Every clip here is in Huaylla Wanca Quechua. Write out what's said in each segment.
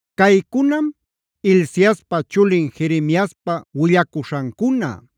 Caycunam Hilciaspa chulin Jeremiaspa willacuśhancuna.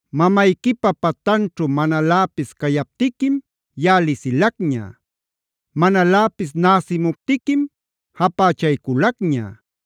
“Mamayquipa patanćhu manaläpis cayaptiquim yaꞌa lisilacña. Manaläpis näsimuptiquim japächayculacña.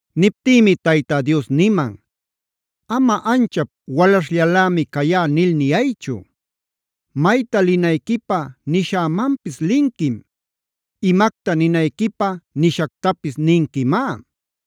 Niptïmi Tayta Dios niman: “Ama ‘anchap walaśhllalämi cayá’ nil niyaychu. Mayta linayquipä nishämanpis linquim. Imacta ninayquipä nishactapis ninquimá.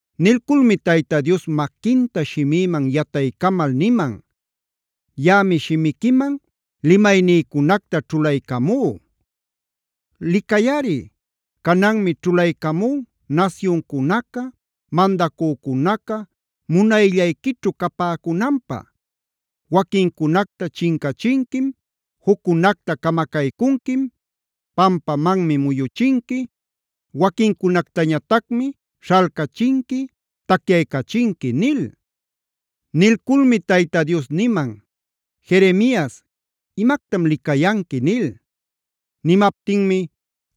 Nilculmi Tayta Dios maquinta shimïman yataycamal niman: “Yaꞌami shimiquiman limaynïcunacta ćhulaycamú. Licayꞌari, cananmi ćhulaycamú nasyuncunaca, mandacücunaca munayllayquićhu capäcunanpä: waquincunacta chincachinquim, juccunacta camacaycunquim, pampamanmi muyuchinqui, waquincunactañatacmi śhalcachinqui, tacyaycachinqui” nil. Nilculmi Tayta Dios niman: “Jeremias, ¿imactam licayanqui?” nil. Nimaptinmi: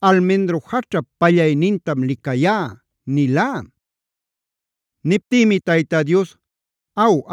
“Almendro jaćhap pallaynintam licayá” nilá. Niptïmi Tayta Dios: “Aw,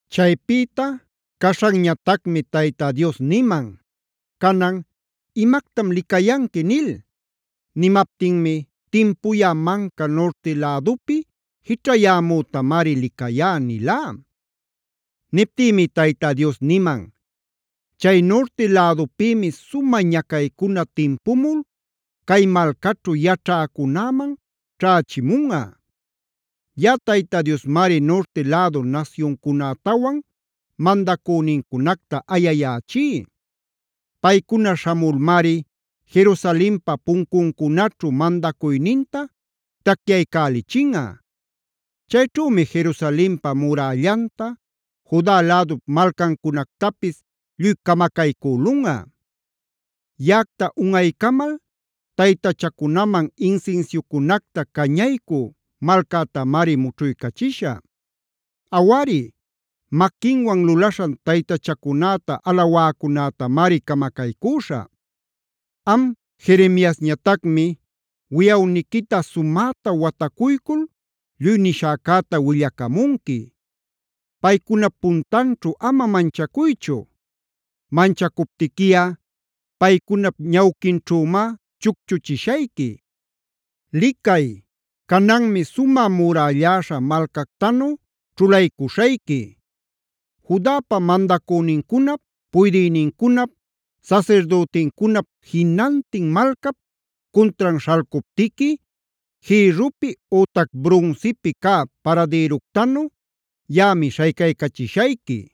Chaypïta caśhanñatacmi Tayta Dios niman: “Canan, ¿imactam licayanqui?” nil. Nimaptinmi: “Timpuyä manca nurti lädupi jićhayämütamari licayá” nilá. Niptïmi Tayta Dios niman: “Chay nurti lädupïmi sumä ñacaycuna timpumul cay malcaćhu yaćhäcunäman ćhächimunꞌa. Yaꞌa Tayta Diosmari nurti lädu nasyuncunätawan mandacünincunacta ayayächí. Paycuna śhamulmari Jerusalenpa puncuncunaćhu mandacuyninta tacyaycälichinꞌa. Chayćhümi Jerusalenpa murällanta, Juda lädup malcancunactapis lluy camacaycülunꞌa. Yaꞌacta unꞌaycamal taytachacunaman insinsiucunacta cañaycü malcätamari mućhuycachishä. Awari, maquinwan lulaśhan taytachacunäta alawäcunätamari camacaycüśhä. “Am Jeremiasñatacmi wiꞌawniquita sumäta watacuycul lluy nishäcäta willacamunqui. Paycunap puntanćhu ama manchacuychu; manchacuptiquiꞌa paycunap ñawquinćhümá chucchuchishayqui. Licay, cananmi sumä murälläśha malcactanu ćhulaycuśhayqui. Judapa mandacünincunap, puydïnincunap, sasirdütincunap jinantin malcap cuntran śhalcuptiqui jïrrupi ütac brunsipih cä paradïructanu yaꞌami śhaycaycachishayqui.